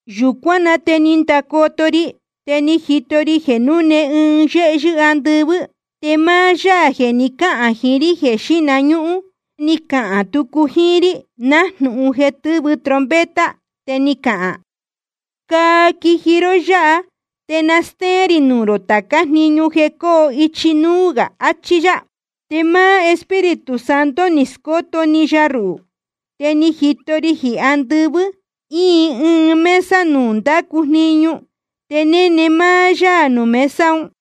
Yūcuán na te ni ndacoto ri, te ni jito ri jeē núne ɨɨn yéhyɨ́ andɨvɨ́, te máá Yaā jeē ni cáhān jiín rí jeē xíhna ñúhún, ni cahān tucu jíín rí nájnūhun jeē tɨ́vɨ trompeta. Te ni cahān: Caa quiji ró yáha, te na stéén rī nuū rō tācá jniñu jeē cóo ichi núú gā, achí yá. Te máá Espíritu Santo ni scóto‑ni ya ruhū. Te ni jito ri jeē andɨvɨ́ íin ɨɨn mesa nuū ndácu jniñu, te néne máá yá nuū mesa un.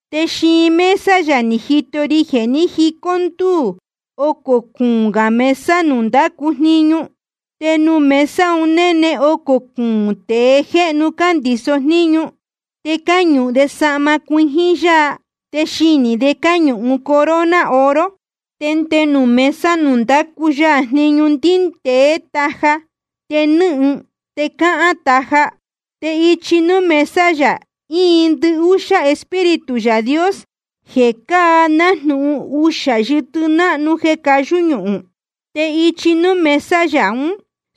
Te xiin mesa yā ni jito ri jeē ní jicó ndúū ocō cuūn gā mesa nuū ndácu jniñu. Te nuū mesa un néne ocō cuūn tēe jéhnu cándiso jníñu. Te cáñuhun de sahma cuijín yaa, te xinī de cáñuhun corona oro. Te nde nuū mesa nuū ndácu ya jniñu ndíndēé taja te nɨ́hɨn te cáhán taja. Te ichi núú mesa yā íin ndɨhúxá Espíritu Yaā Dios, jeē cáa nájnūhun uxā yɨtɨ náhnu jeē cayú ñuhūn. Te ichi núú mesa yā ún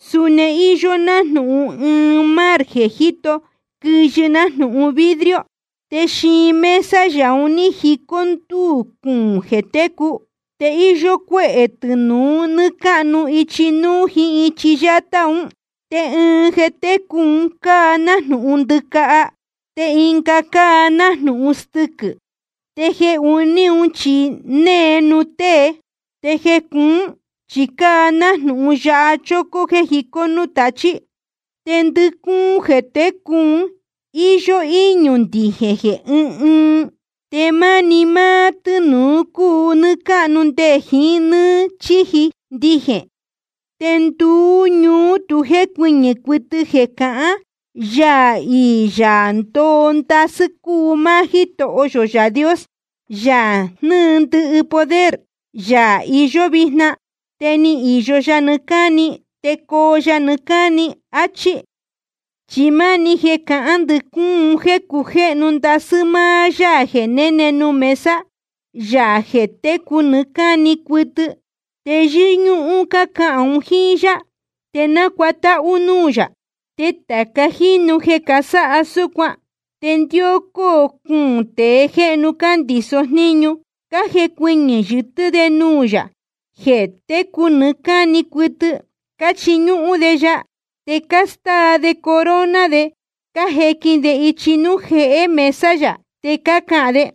suni íyó nájnūhun ɨɨn mar jeē jíto quɨyɨ nájnūhun vidrio. Te xiin mesa yā un ní jicó ndúū cuūn jeē técu. Te íyó cuéhē tɨnūu nɨ́ɨ́ cáhnu ichi núú jíín ichi yátá un. Te ɨɨn jeē técu un cáa nájnūhun ndɨcaha. Te ɨnga cáa nájnūhun stɨquɨ̄. Te jeē uní chi née nuū tée. Te jeē cuún chi cáa nájnūhun yaha chócó jéē jicó núū tachí. Te ndɨcúún jeē técu un íyó íñū ndijēn jeē ɨ́ɨn ɨɨn. Te máni máá tɨ́nūu cúu nɨ́ɨ́ cáhnu nde jiín nɨ́ɨ́ chíji ndijēn. Te nduú ñuú tu jécuɨñɨ̄ cuɨtɨ jeē cahán: Yaā iī Yaā ndoo ndasɨ́ cúu máá Jítoho yō Yaā Dios, Yaā jnɨ́ɨ ndɨhɨ poder, Yaā iyó vijna, te ni īyo yá nɨɨ́ cáni, te coo ya nɨɨ́ cáni. Achí. Chi máni jeē cácahān ndɨcúún un jéē cujéhnu ndasɨ́ máá Yaā jeē néne nuū mesa, Yaā jeē técu nɨɨ́ cáni cuɨtɨ. Te yɨ́ñúhún cácahān un jíín yá, te nácuatáhú núū yā. Te tāca jínu jeē casáha súcuan, te ndɨhócó cuūn tēe jéhnu cándiso jníñu, cájecuɨñɨ̄ yɨtɨ́ de nuū Yaā jeē técu nɨɨ́ cáni cuɨtɨ, cáchiñúhún de ya. Te cástáa de corona de, cájequin de ichi núú jehé mesa yā. Te cácahān de: